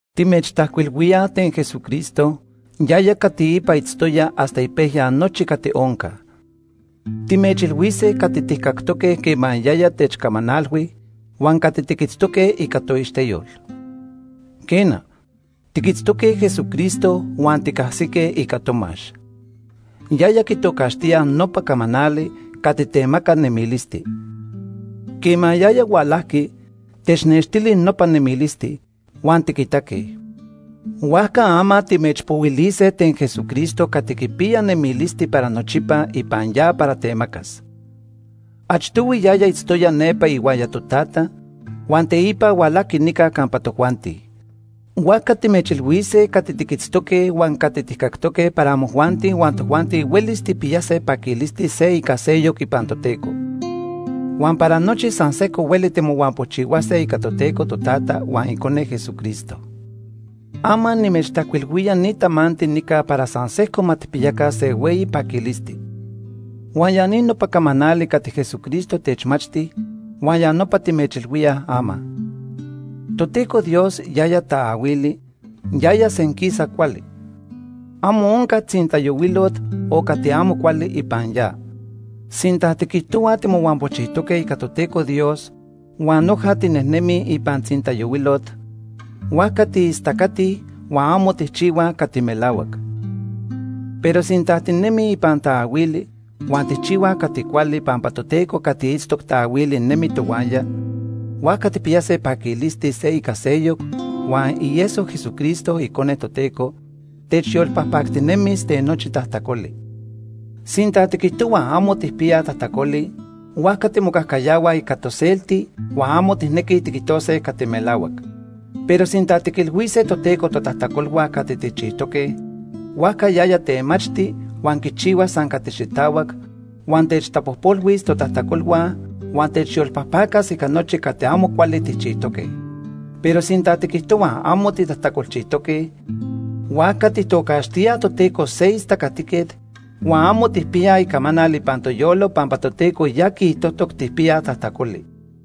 Timechtajcuilhuíaj ten Jesucristo, yaya cati ipa itztoya hasta ipejya nochi cati onca. Timechilhuise cati tijcactoque quema yaya techcamanalhui huan cati tiquitztoque ica toixteyol. Quena, tiquitztoque Jesucristo huan ticajsique ica tomax. Yaya quitocaxtíaj nopa “camanali” cati temaca nemilisti. Quema yaya hualajqui, technextili nopa nemilisti, huan tiquitaque. Huajca ama timechpohuilise ten Jesucristo cati quipiya nemilisti para nochipa ipan ya para temacas. Achtohui yaya itztoya nepa ihuaya Totata huan teipa hualajqui nica campa tojuanti. Huajca timechilhuise cati tiquitztoque huan cati tijcactoque para amojuanti huan tojuanti huelis tijpiyase paquilisti se ica seyoc ipan Toteco. Huan para nochi san sejco hueli timohuampochihuase ica Toteco Totata huan Icone Jesucristo. Ama nimechtajcuilhuía ni tamanti nica para san sejco ma tijpiyaca se hueyi paquilisti. Huan ya ni nopa camanali cati Jesucristo techmachti huan ya nopa timechilhuíaj ama. Toteco Dios yaya taahuili, yaya senquisa cuali. Amo onca tzintayohuilot o cati amo cuali ipan ya. Sinta tiquijtohuaj timohuampojchijtoque ica Toteco Dios huan noja tinejnemij ipan tzintayohuilot, huajca tiistacatij huan amo tijchihuaj cati melahuac. Pero sinta tinemij ipan taahuili huan tijchihuaj cati cuali pampa Toteco cati itztoc taahuili nemi tohuaya, huajca tijpiyase paquilisti se ica seyoc, huan ieso Jesucristo, Icone Toteco, techyolpajpactinemis ten nochi tajtacoli. Sinta tiquijtohuaj amo tijpiyaj tajtacoli, huajca timocajcayahuaj ica toselti huan amo tijnequij tiquijtose cati melahuac. Pero sinta tiquilhuise Toteco totajtacolhua cati tijchijtoque, huajca yaya temachti huan quichihua san cati xitahuac, huan techtapojpolhuis totajtacolhua huan techyolpajpacas ica nochi cati amo cuali tijchijtoque. Pero sinta tiquijtohuaj amo titajtacolchijtoque, huajca tijtocaxtíaj Toteco se istacatiquet huan amo tijpiyaj icamanal ipan toyolo pampa Toteco ya quiijtojtoc tijpiyaj tajtacoli.